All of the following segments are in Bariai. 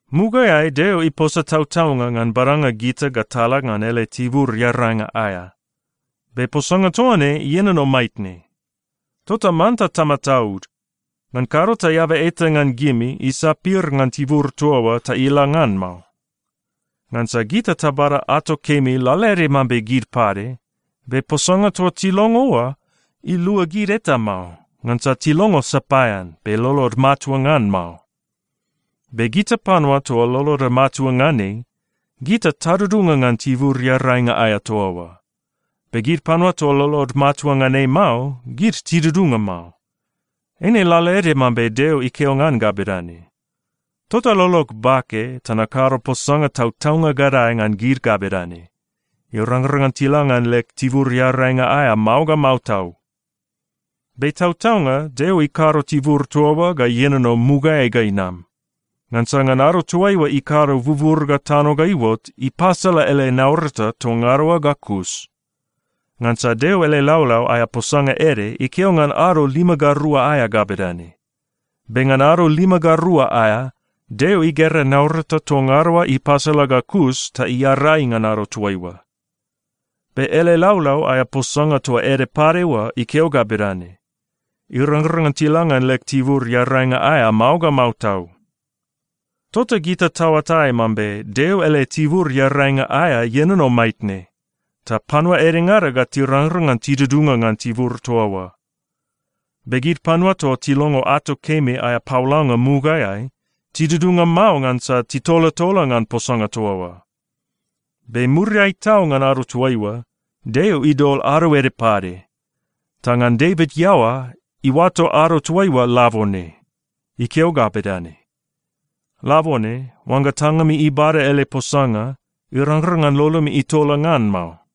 Mugaeai Deo iposa tautaunga ngan badanga gita ga tala ngan ele tibur earainga aea. Be posanga toa ne ienono maitne. Tota manta tamataud. Ngan kado ta eaba eta ngan gimi isapir ngan tibur toa oa ta ila ngan mao. Ngansa gita tabada ato kemi lalaede mambe gid pade, be posanga toa tilongo oa ilua gid eta mao, ngansa tilongo sapaean, be lolod matua ngan mao. Be gita panua toa loloda matua ngan ei, gita tadudunga ngan tibur earainga aea toa oa. Be gid panua toa lolod matua ngan ei mao, gid tidudunga mao. Eine lalaede mambe Deo ikeo ngan ga bedane, “Tota lolog bake ta nakado posanga tautaunga gadae ngan gid ga bedane, ‘Irangrang ngan tila ngan leg tibur earainga aea mao ga mao tau.’” Be tautaunga Deo ikado tibur toa oa ga ienono mugaeai ga inam. Ngansa ngan ado toaiua ikado bubur ga tano ga iuot, ipasala ele naurata toa ngada oa ga kus. Ngansa Deo ele laulau aea posanga ede ikeo ngan ado lima ga rua aea ga bedane, “Be ngan ado lima ga rua aea, Deo igera naurata toa ngada oa ipasala ga kus, ta iarai ngan ado toaiua.” Be ele laulau aea posanga toa ede pade oa ikeo ga bedane, “Irangrang ngan tila ngan leg tibur earainga aea mao ga mao tau.” Tota gita taoatai mambe Deo ele tibur earainga aea ienono maitne, ta panua edengada ga tirangrang ngan tidudunga ngan tibur toa oa. Be gid panua toa tilongo ato kemi aea paolanga mugaeai, tidudunga mao ngansa titolatola ngan posanga toa oa. Be muriai tau ngan ado toaiua, Deo idol ado ede pade. Ta ngan Devit iaoa, iuato ado toaiua “Labone.” Ikeo ga bedane, “Labone, oangga tangami ibada ele posanga, irangrang ngan lolomi itola ngan mao.”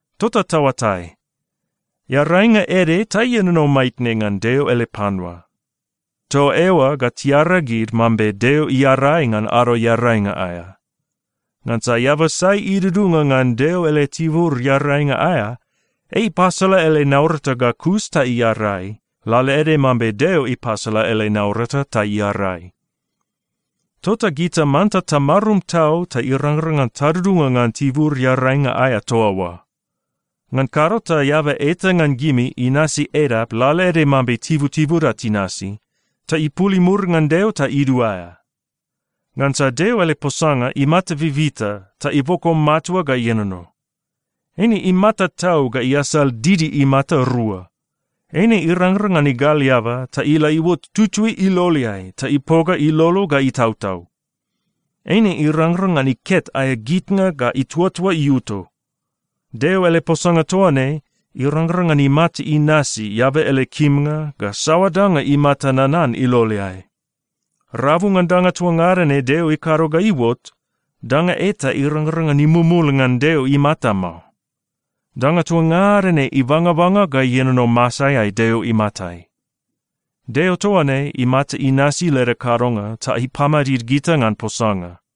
Tota taoatai, earainga ede ta ienono maitne ngan Deo ele panua. Toa eoa ga tiaragid mambe Deo iarai ngan Ado Earainga aea. Ngansa eaba sai idudunga ngan Deo ele tibur earainga aea, ei ipasala ele naurata ga kus ta iarai, lalaede mambe Deo ipasala ele naurata ta iarai. Tota gita manta tamarum tau ta irangrang ngan tadudunga ngan tibur earainga aea toa oa. Ngan kado ta eaba eta ngan gimi inasi edap lalaede mambe tibutibuda tinasi, ta ipul imur ngan Deo ta iduaea. Ngansa Deo ele posanga imata bibita ta iboko matua ga ienono. Eine imata tau ga iasal didi imata rua. Eine irangrang ngan igal eaba ta ila iuot tutui iloleai ta ipoga ilolo ga itautau. Eine irangrang ngan iket aea gitnga ga ituatua iuto. Deo ele posanga toa ne irangrang ngan imata inasi eaba ele kimnga ga saoa danga imata nanan iloleai. Rabu ngan danga toa ngada ne Deo ikado ga iuot, danga eta irangrang ngan imumul ngan Deo imata mao. Danga toa ngada ne ibangabanga ga ienono masaeai Deo imatai. Deo toa ne imata inasi leda kadonga ta ipamadid gita ngan posanga.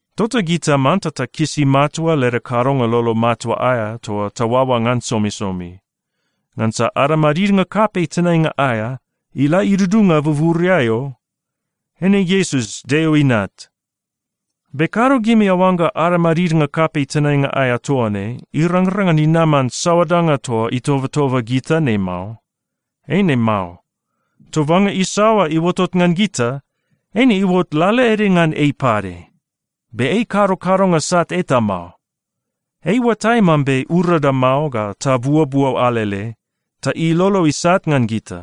Tota gita manta takisi matua leda kadonga lolo matua aea toa taoaoa ngan somisomi, ngansa ada madidnga kapei tenainga aea ila idudunga buburiai o. Eine Iesus Deo Inat. Be kado gimi aoangga ada madidnga kapei tenainga aea toa ne irangrang ngan inaman saoa danga toa itobatoba gita ne mao. Eine mao. Tobanga isaoa iuotot ngan gita, eine iuot lalaede ngan ei pade. Be ei ikado kadonga sat eta mao. Ei iuatai mambe urada mao ga tabuobuo alele, ta ilolo isat ngan gita.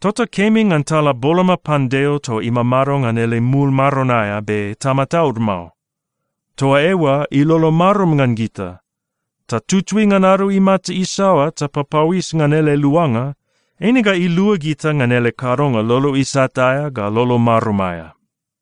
Tota kemi ngan tala boloma pan Deo toa imamado ngan ele mul maron aea, be tamataud mao. Toa eoa ilolo marum ngan gita. Ta tutui ngan ado imata isaoa tapapauis ngan ele luanga, eine ga ilua gita ngan ele kadonga lolo isat aea ga lolo marum aea.